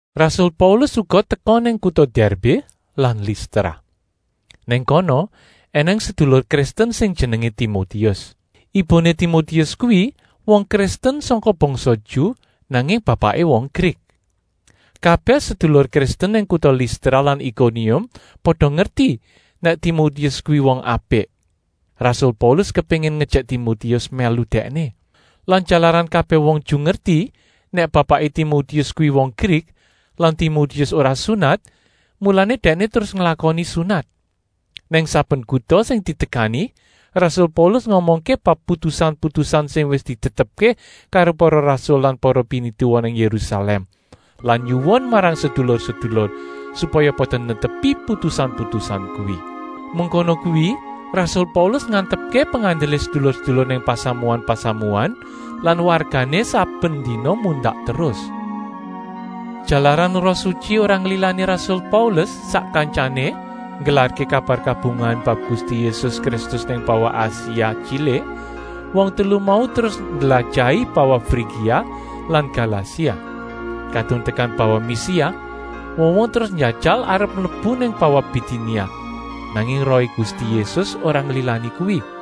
Rasul Paulus uga teka nang kuta Dèrbé lan Listra. Nang kono ènèng sedulur Kristen sing jenengé Timotius. Ibuné Timotius kuwi wong Kristen sangka bangsa Ju, nanging bapaké wong Grik. Kabèh sedulur Kristen nang kuta Listra lan Ikonium pada ngerti nèk Timotius kuwi wong apik. Rasul Paulus kepéngin ngejèk Timotius mèlu dèkné. Lan jalaran kabèh wong Ju ngerti nèk bapaké Timotius kuwi wong Grik lan Timotius ora sunat, mulané dèkné terus nglakoni sunat. Nang saben kuta sing ditekani, rasul Paulus ngomongké bab putusan-putusan sing wis ditetepké karo para rasul lan para pinituwa nang Yérusalèm lan nyuwun marang sedulur-sedulur, supaya pada netepi putusan-putusan kuwi. Mengkono kuwi rasul Paulus ngantepké pengandelé sedulur-sedulur nang pasamuan-pasamuan lan wargané saben dina mundak terus. Jalaran Roh Sutyi ora nglilani rasul Paulus sak kantyané nggelarké kabar kabungahan bab Gusti Yésus Kristus nang bawah Asia Tyilik, wong telu mau terus ndlajahi bawah Frigia lan Galasia. Kadung tekan bawah Misia, wong-wong terus njajal arep mlebu nang bawah Bitinia, nanging Rohé Gusti Yésus ora nglilani kuwi.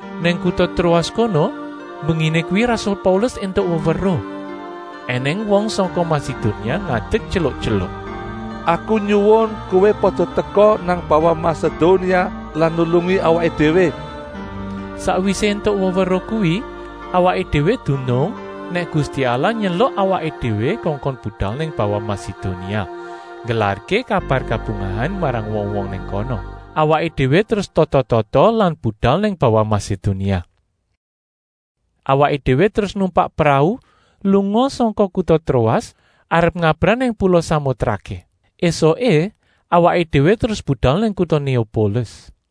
Nang kuta Troas kono mbenginé kuwi rasul Paulus éntuk weweruh, ènèng wong sangka Masedonia ngadek tyeluk-tyeluk: “Aku nyuwun kowé pada teka nang bawah Masedonia lan nulungi awaké déwé.” Sakwisé éntuk weweruh kuwi awaké déwé dunung nèk Gusti Allah nyeluk awaké déwé kongkon budal nang bawah Masedonia nggelarké kabar kabungahan marang wong-wong nang kono. Awaké déwé terus tata-tata lan budal nang bawah Masedonia. Awaké déwé terus numpak prau lunga sangka kuta Troas arep ngabrah nang pula Samotraké. Esuké awaké déwé terus budal nang kuta Néopolis.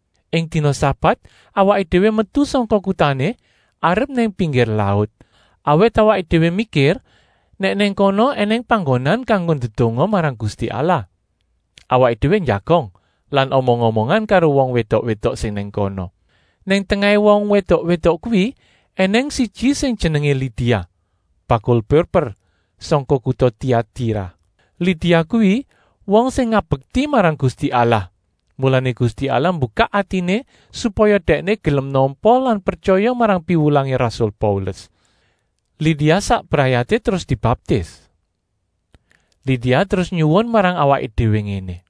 Ing dina sabat awaké déwé metu sangka kutané arep nang pinggir laut, awit awaké déwé mikir nèk nang kono ènèng panggonan kanggo ndedonga marang Gusti Allah. Awaké déwé njagong lan omong-omongan karo wong wédok-wédok sing nang kono. Nang tengahé wong wédok-wédok kuwi ènèng siji sing jenengé Lidia, bakul purper sangka kuta Tiatira. Lidia kuwi wong sing ngabekti marang Gusti Allah, mulané Gusti Allah mbukak atiné supaya dèkné gelem nampa lan pretyaya marang piwulangé rasul Paulus. Lidia sak brayaté terus dibaptis. Lidia terus nyuwun marang awaké déwé ngéné: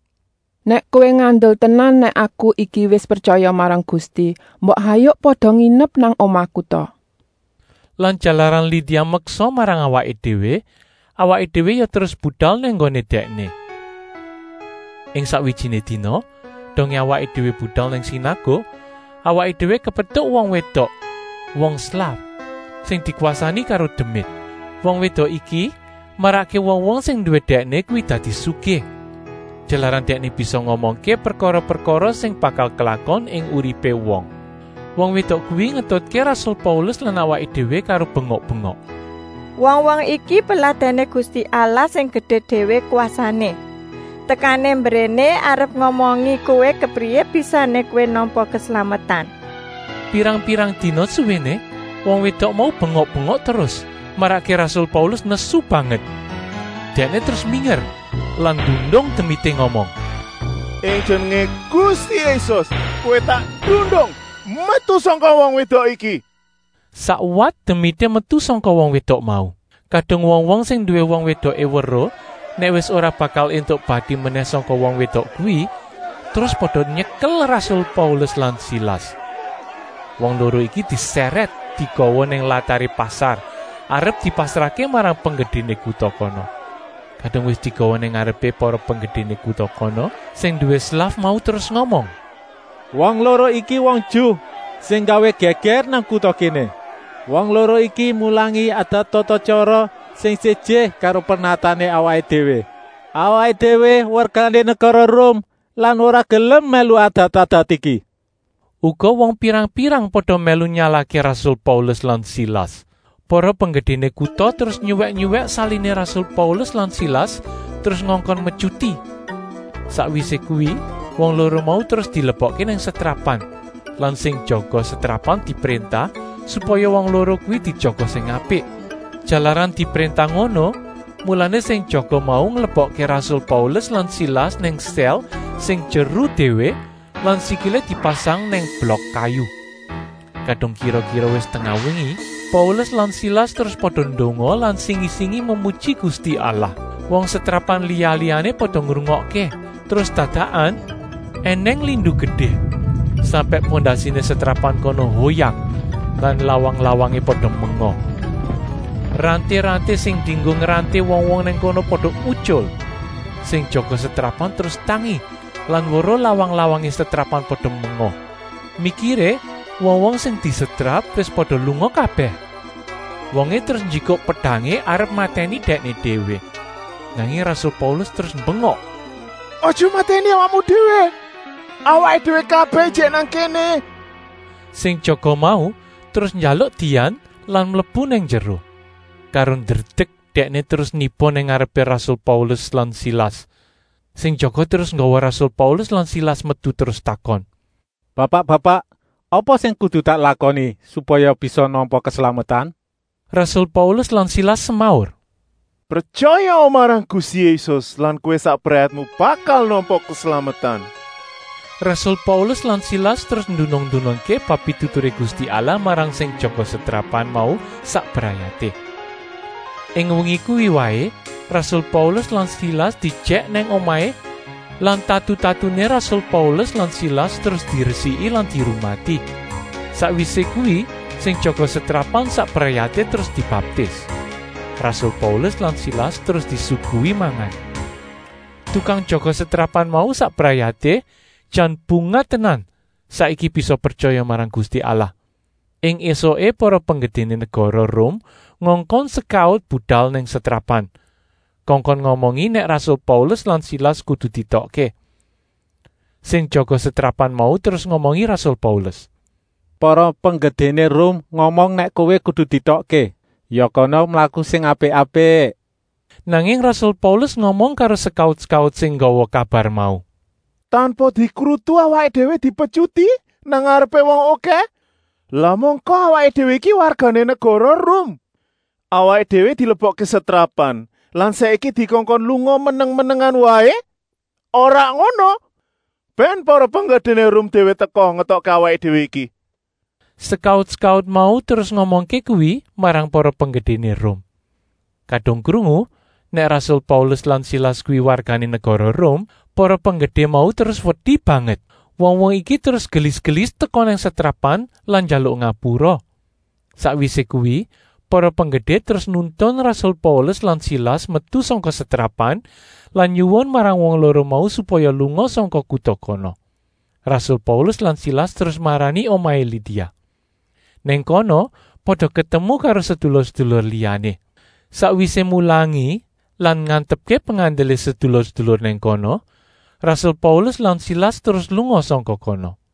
“Nèk kowé ngandel tenan nèk aku iki wis pretyaya marang Gusti, mbok hayuk pada nginep nang omahku ta.” Lan jalaran Lidia meksa marang awaké déwé, awaké déwé ya terus budal nang nggoné dèkné. Ing sakwijiné dina, dongé awaké déwé budal nang sinaguk, awaké déwé kepetuk wong wédok, wong slaf, sing dikwasani karo demit. Wong wédok iki marakké wong-wong sing nduwé dèkné kuwi dadi sugih, jalaran dèkné bisa ngomongké prekara-prekara sing bakal klakon ing uripé wong. Wong wédok kuwi ngetutké rasul Paulus lan awaké déwé karo bengok-bengok: “Wong-wong iki peladèné Gusti Allah sing gedé déwé kwasané. Tekané mbréné arep ngomongi kowé kepriyé bisané kowé nampa keslametan!” Pirang-pirang dina suwéné wong wédok mau bengok-bengok terus, marakké rasul Paulus nesu banget. Dèkné terus minger lan nundung demité ngomong: “Ing jenengé Gusti Yésus, kowé tak tundung metu sangka wong wédok iki!” Sakwat demité metu sangka wong wédok mau. Kadung wong-wong sing nduwé wong wédoké weruh nèk wis ora bakal éntuk bati menèh sangka wong wédok kuwi, terus pada nyekel rasul Paulus lan Silas. Wong loro iki disèrèt digawa nang lataré pasar arep dipasrahké marang penggedéné kuta kono. Kadung wis digawa nang ngarepé para penggedéné kuta kono, sing nduwé slaf mau terus ngomong: “Wong loro iki wong Ju sing nggawé gègèr nang kuta kéné. Wong loro iki mulangi adat-tata-tyara sing séjé karo pernatané awaké déwé. Awaké déwé wargané negara Rum lan ora gelem mèlu adat-adat iki!” Uga wong pirang-pirang pada mèlu nyalahké rasul Paulus lan Silas. Para penggedéné kuta terus nyuwèk-nyuwèk saliné rasul Paulus lan Silas terus ngongkon metyuti. Sakwisé kuwi wong loro mau terus dilebokké nang setrapan lan sing jaga setrapan dipréntah, supaya wong loro kuwi dijaga sing apik. Jalaran dipréntah ngono, mulané sing jaga mau nglebokké rasul Paulus lan Silas nang sèl sing jeru déwé lan sikilé dipasang nang blok kayu. Kadung kira-kira wis tengah wengi, Paulus lan Silas terus pada ndonga lan singi-singi memuji Gusti Allah. Wong setrapan liya-liyané pada ngrungokké. Terus dadakan ènèng lindu gedé sampèk pondasiné setrapan kono hoyak lan lawang-lawangé pada menga. Ranté-ranté sing dienggo ngranté wong-wong nang kono pada utyul. Sing jaga setrapan terus tangi lan weruh lawang-lawangé setrapan pada menga. Mikiré wong-wong sing disetrap wis pada lunga kabèh. Wongé terus njikuk pedangé arep matèni dèkné déwé. Nanging rasul Paulus terus mbengok: “Aja matèni awakmu déwé! Awaké déwé kabèh ijik nang kéné!” Sing jaga mau terus njaluk dian lan mlebu nang njero. Karo ndredek dèkné terus niba nang ngarepé rasul Paulus lan Silas. Sing jaga terus nggawa rasul Paulus lan Silas metu terus takon: “Bapak-bapak, apa sing kudu tak lakoni supaya bisa nampa keslametan?” Rasul Paulus lan Silas semaur: “Pretyayaa marang Gusti Yésus lan kowé sak brayatmu bakal nampa keslametan!” Rasul Paulus lan Silas terus ndunung-ndunungké bab pituturé Gusti Allah marang sing jaga setrapan mau sak brayaté. Ing wengi kuwi waé rasul Paulus lan Silas diejèk nang omahé lan tatu-tatuné rasul Paulus lan Silas terus diresiki lan dirumati. Sakwisé kuwi sing jaga setrapan sak brayaté terus dibaptis. Rasul Paulus lan Silas terus disuguhi mangan. Tukang jaga setrapan mau sak brayaté jan bungah tenan saiki bisa pretyaya marang Gusti Allah. Ing ésuké para penggedéné negara Rum ngongkon sekaut budal nang setrapan, kongkon ngomongi nèk rasul Paulus lan Silas kudu dietokké. Sing jaga setrapan mau terus ngomongi rasul Paulus: “Para penggedéné Rum ngomong nèk kowé kudu dietokké. Ya kana mlaku sing apik-apik!” Nanging rasul Paulus ngomong karo sekaut-sekaut sing nggawa kabar mau: “Tanpa dikrutu awaké déwé dipetyuti nang ngarepé wong okèh, lah mangka awaké déwé iki wargané negara Rum. Awaké déwé dilebokké setrapan lan saiki dikongkon lunga meneng-menengan waé. Ora ngono! Bèn para penggedéné Rum déwé teka ngetokké awaké déwé iki!” Sekaut-sekaut mau terus ngomongké kuwi marang para penggedéné Rum. Kadung krungu nèk rasul Paulus lan Silas kuwi wargané negara Rum, para penggedé mau terus wedi banget. Wong-wong iki terus gelis-gelis teka nang setrapan lan njaluk ngapura. Sakwisé kuwi para penggedé terus nuntun rasul Paulus lan Silas metu sangka setrapan lan nyuwun marang wong loro mau supaya lunga sangka kuta kono. Rasul Paulus lan Silas terus marani omahé Lidia. Nang kono pada ketemu karo sedulur-sedulur liyané. Sakwisé mulangi lan ngantepké pengandelé sedulur-sedulur nang kono, rasul Paulus lan Silas terus lunga sangka kono.